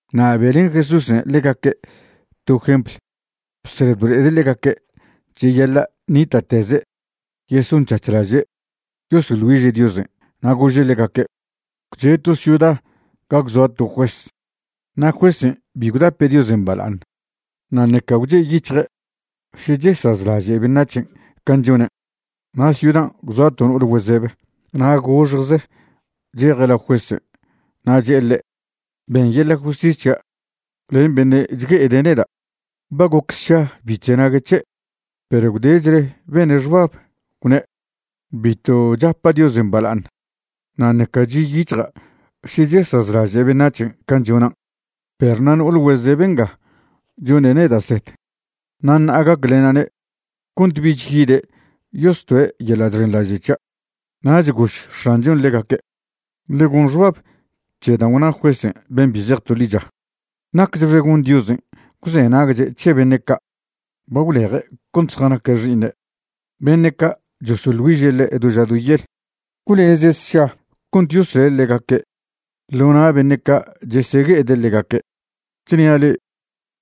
Na' be'len Jesúsen' ḻegaque' to jempl bsed blo'ede' ḻegaque' cheyaḻa' ṉita'teze' yesonc̱hac̱hlaže' yosoḻ güiže' Diosen'. Na' gože' ḻegaque': ―Gwche' to ciuda ga gwzoa to juez na' juezen' bi gwdape' Diosen' bala'aṉ na' ṉeca gwche'yic̱hje' še chesazlaže' beṉac̱hen' can' chonen'. Na' ciudan' gwzoa to no'ol güezeb, na' goxjze cheje' lao juezen' na' che'e ḻe': “Ben yeḻa' justis c̱hia' len beṉe' chgue'ede' neda'.” Ba goc sša bi chzenague' c̱he', perw gwdechle bene' xbab, gwne': “Bitw chapa' Diosen' bala'aṉ na' ṉeca chi'yic̱hja' še chesazlaže' beṉac̱hen' can' chonan'. Perw na' no'ol güezeb nga chone' neda' zed, na' ṉa'a gaclena'ne' cont bich yide' yostoe' yeḻa' chxenḻaže' c̱hia'.” Nach gož X̱anchon' ḻegaque': ―Ḻe goṉ xbab c̱he dan' gwna juezen' ben' bi zej to ḻicha. Nacchxe gon Diosen' gwzenagche' c̱he beṉe' ca' ba gwleje' cont zjanaque' xi'iṉe', beṉe' ca' chosoḻ güiže' ḻe' do ža do yel. ¿Gwleze' sša cont yosle' ḻegaque' ḻo na' beṉe' ca' chesegue'ede' ḻegaque'? Chnia' le'e,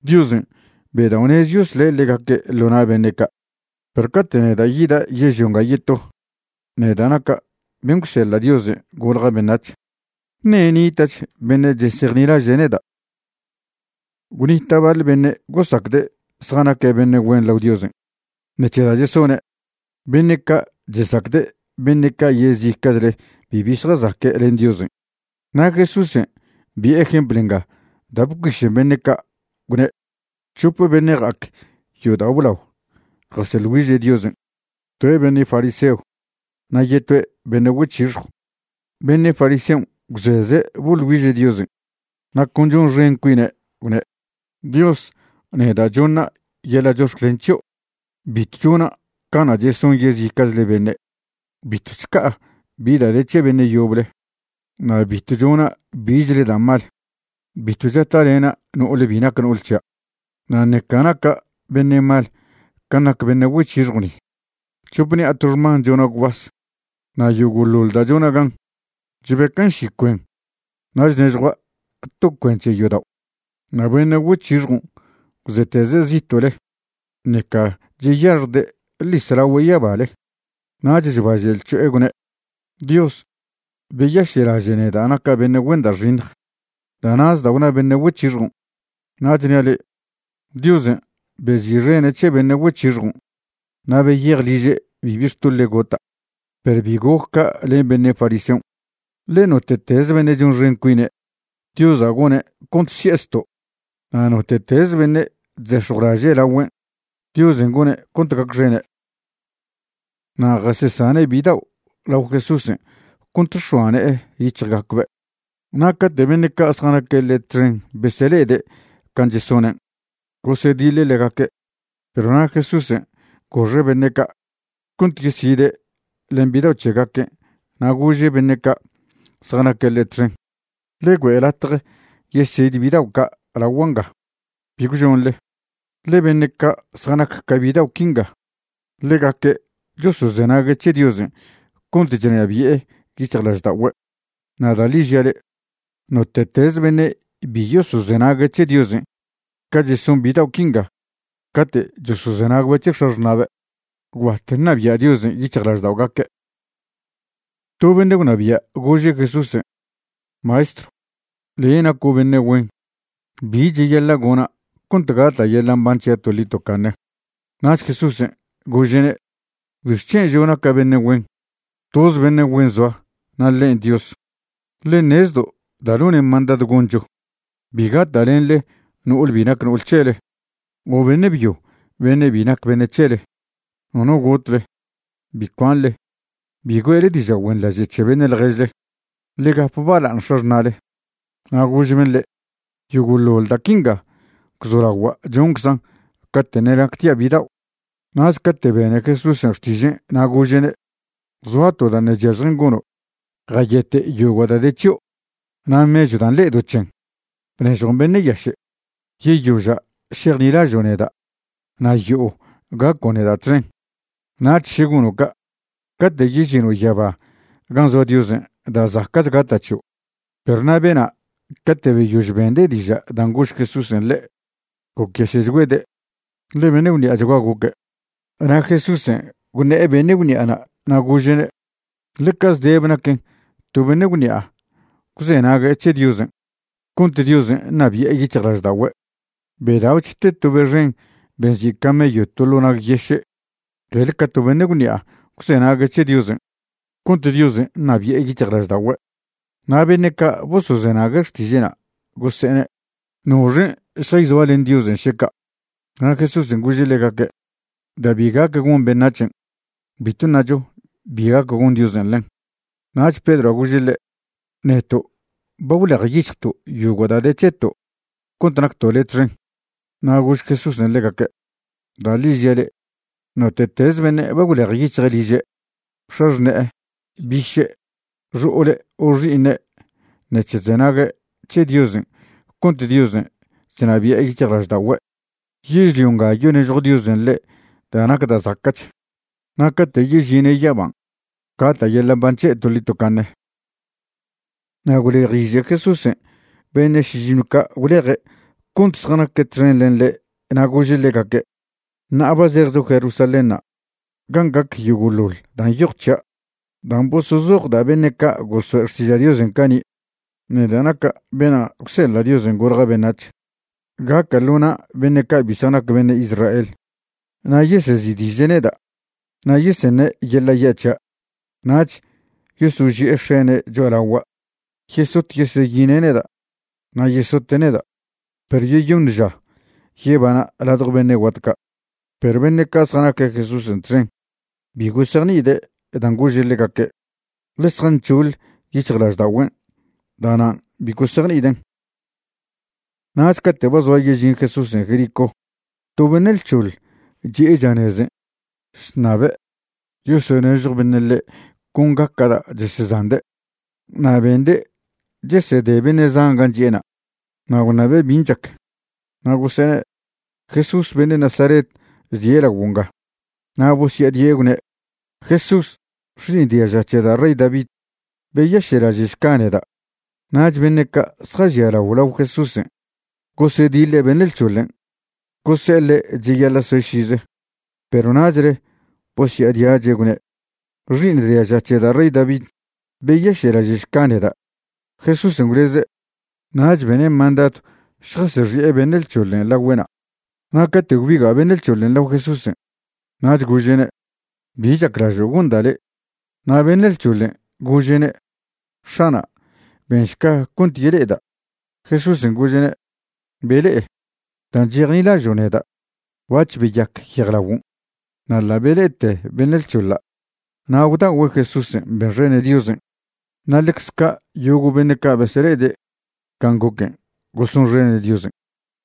Diosen' bedao'nez yosle' ḻegaque' ḻo na' beṉe' ca'. Perw cate' neda' yida' yežlio nga yeto, neda' naca' ben' gwseḻa' Diosen' golja' beṉac̱h, ¿ṉe' nita'ch beṉe' chesejnilaže' neda'? Gwnita' baḻ beṉe' gosacde' zjanaque' beṉe' güen lao Diosen' ṉec̱he da' chesone'. Beṉe' ca' chesacde' beṉe' ca' yezica'chle bibi zjazaque' len Diosen'. Na' Jesúsen' bi'e jempl nga da' bcuišen beṉe' ca', gwne': ―C̱hope beṉe' ja'ac yodao' blao jaseḻ güiže' Diosen', toe' beṉe' fariseo na' yetoe' beṉe' güec̱hixjw. Beṉe' fariseon' gwzeze' boḻ güiže' Diosen' na' con chonxen cuine', gwne': “Dios, neda' chona' yeḻa' chox̱clen c̱hio' bitw chona' cana' cheson yezica'chle beṉe'. Bitw chca'a bi da' de c̱he beṉe' yoble, na' bitw chona' bichle da' mal. Bitw chata'lena' no'ol bi nac no'ol c̱hia', na' ṉeca naca' beṉe' mal can' nac beṉe' güec̱hixjw ni. C̱hope ṉi'a to xman chona' gwbas, na' yogo'ḻoḻ da' chona' gan, chbecan' ši cuen na' chnežjua' to cuen c̱he yodao'.” Na' beṉe' güec̱hixjon' gwzeteze' zito'le, ṉeca cheyaxjde' ḻis lagüe' yabale. Nach chbaže' lc̱ho'e gwne': “Dios, beyaše'laže' neda' naca' beṉe' güen da' xiṉj.” Da'na'z da' gwna beṉe' güec̱hixjon'. Na' chnia' le'e, Diosen' bezi'xene' c̱he beṉe' güec̱hixjon' na' beyej liže' bibi xtoḻe' gota'. Perw bi goc ca' len beṉe' fariseon'. Ḻe note'tez beṉe' chonxen cuine', Diosa' gone' cont si'e zto', na' note'tez beṉe' chzex̱jwlaže' lagüen', Diosen' gone' cont gacxene'. Na' jasesane' bidao' lao Jesúsen' cont x̱oa ne'e yic̱hjgacbe'. Na' cate' beṉe' ca' zjanaque' ḻe' txen besele'ede' can' chesonen', gosediḻe' ḻegaque'. Perw na' Jesúsen' goxe' beṉe' ca' cont yeside' len bidao' c̱hegaquen', na' gože' beṉe' ca' zjanaque' ḻe' txen: ―Ḻe güe' latje yesid bidao' ca' lagua' nga, bi gwžoṉle, ḻe beṉe' ca' zjanac ca bidao' quinga, ḻegaque' chosozenague' c̱he Diosen' cont chnabi'e yic̱hjlažda'ogüe'. Na' da' ḻi žia' le'e, note'teze beṉe' bi yosozenague' c̱he Diosen' ca cheson bidao' quinga cate' chosozenagbe' c̱he x̱axṉa'be', gwbat ṉabia' Diosen' yic̱hjlažda'ogaque'. To beṉe' gwnabia' gože' Jesúsen': ―Maestrw, le' naco' beṉe' güen. ¿Bi cheyaḻa' gona' cont gata' yeḻa' mban c̱hia' toḻi tocaṉe? Nach Jesúsen' gože'ne': ―¿Bixc̱hen' žo' naca' beṉe' güen? Toz beṉe' güen zoa, na' ḻen' Dios. Le' ṉezdo' da' none' mandadw goncho: “Bi gata'lenḻe no'ol bi nac no'ol c̱hele o beṉe' byo beṉe' bi nac beṉe' c̱hele. Nono gotle. Bi cuanḻe. Bi güe'le diža' güenḻaže' c̱he beṉe' ḻježle. Ḻe gap bala'aṉ x̱axṉa'le.” Na' gož ben' ḻe': ―Yogo'ḻoḻ da' quinga gwzolagua' chonczan' cate' ṉe' nactia' bidao'. Nach cate' bene Jesúsen' xtižen' na' gože'ne': ―Zoa to da' ṉe' chyažjen gono', jayete' yogo' da' de c̱hio', na' mechw dan' le'edo' c̱hen, bnežjon beṉe' yaše'. Yeyoža' šejnilažo' neda' na' yo'o gaco' neda' txen. Nach še gono' ca', cate' yežino' yaba gan' zoa Diosen' da' zaca'ch gata' c̱hio'. Perw na' bena' cate' beyož bende' diža' dan' gož Jesúsen' ḻe', gocyaše'chgüede', ḻe beṉe' gwṉi'achgua goque'. Na' Jesúsen' gwṉe'e beṉe' gwṉi'ana' na' gože'ne': ―Ḻeca zdebe naquen to beṉe' gwṉi'a gwzenague' c̱he Diosen' cont Diosen' ṉabi'e yic̱hjlažda'ogüe'. Bedao'ch te to be xen be nzi' camello to ḻo' nag yeše' clel ca to beṉe' gwṉi'a gwzenague' c̱he Diosen' cont Diosen' ṉabi'e yic̱hjlažda'ogüe'. Na' beṉe' ca' bosozenague' xtiže'na' gose'ene': ―¿Noxen' šjayzoa len Diosen' še ca'? Na' Jesúsen' gože' ḻegaque': ―Da' bi gac gon beṉac̱hen', bitw ṉacho bi gac gon Diosen' ḻen. Nach Pedroa' gože' ḻe': ―Neto' ba gwlejyic̱hjto' yogo' da' de c̱heto' cont nacto' le' txen. Na' gož Jesúsen' ḻegaque': ―Da' ḻi žia' le'e, note'teze beṉe' ba gwlejyic̱hje' liže', x̱axṉe'e, biše', xo'ole' o xi'iṉe' ṉec̱he chzenague' c̱he Diosen' cont Diosen' chnabi'e yic̱hjlažda'ogüe', yežlio nga yonežjo Diosen' ḻe' da' nac da' zaca'ch, na' cate' yežine' yaban' gata' yeḻa' mban c̱he' toḻi tocaṉe. Na' gwlejiže Jesúsen' beṉe' šižiṉw ca' gwleje' cont zjanaque' txen len ḻe' na' gože' ḻegaque': ―Ṉa'a ba zejcho Jerusalénṉa' gan' gac yogo'ḻoḻ dan' nyoj c̱hia' dan' bosozoj da' beṉe' ca' gosoe' xtiža' Diosen' cani', neda' naca' bena' gwseḻa' Diosen' golja' beṉac̱h. Gaca' ḻo na' beṉe' ca' bi zjanac beṉe' Israel, na' yesezi'diže' neda', na' yeseṉe' yeḻa' ya' c̱hia', nach yosoži'e xene' cho'alagua'. Yesot yeseyine' neda' na' yesote' neda', perw yeyoṉ ža yebana' ladjo beṉe' guat ca'. Perw beṉe' ca' zjanaque' Jesúsen' txen bi gosejni'ide' dan' gože' ḻegaque', ḻe zjanc̱hoḻ yic̱hjlažda'ogüen', da'nan' bi gosejni'iden'. Nach cate' ba zoa yežin Jesúsen' Jericó, to beṉe' lc̱hoḻ chi'e chanezen' chṉabe' yosonežjo beṉe' ḻe' con gaca' da' chesezande'. Na' bende' chesede beṉe' zan gan' chi'ena', na' gwṉabe' bin' chac. Na' gose'ene': ―Jesús beṉe' Nazaret chdie' laguo' nga. Na' bosya'adie' gwne': ―Jesús, xi'iṉ diaža c̱he da' rey David, beyaše'laže'šca neda'. Nach beṉe' ca' zjažialao lao Jesúsen' gosediḻe' beṉe' lc̱hoḻen', gose'e ḻe' cheyaḻa' soe' šize, perw nachle bosya'adiache', gwne': ―Xi'iṉ diaža c̱he da' rey David, beyaše'laže'šca neda'. Jesúsen' gwleze', nach bene' mandadw šjasexi'e beṉe' lc̱hoḻen' lagüe'na'. Na' cate' gwbiga' beṉe' lc̱hoḻen' lao Jesúsen', nach gože'ne': ―¿Bi chaclažo' gonda' le'? Na' beṉe' lc̱hoḻen' gože'ne': ―X̱ana', benšca cont yele'eda'. Jesúsen' gože'ne': ―Bele'e. Dan' chejnilažo' neda' bac̱h beyac yejlagon'. Na' ḻa' bele'ete beṉe' lc̱hoḻa' na' gwda'ogüe' Jesúsen' benxene' Diosen'. Na' ḻecze ca' yogo' beṉe' ca' besele'ede' can' goquen' gosonxene' Diosen'.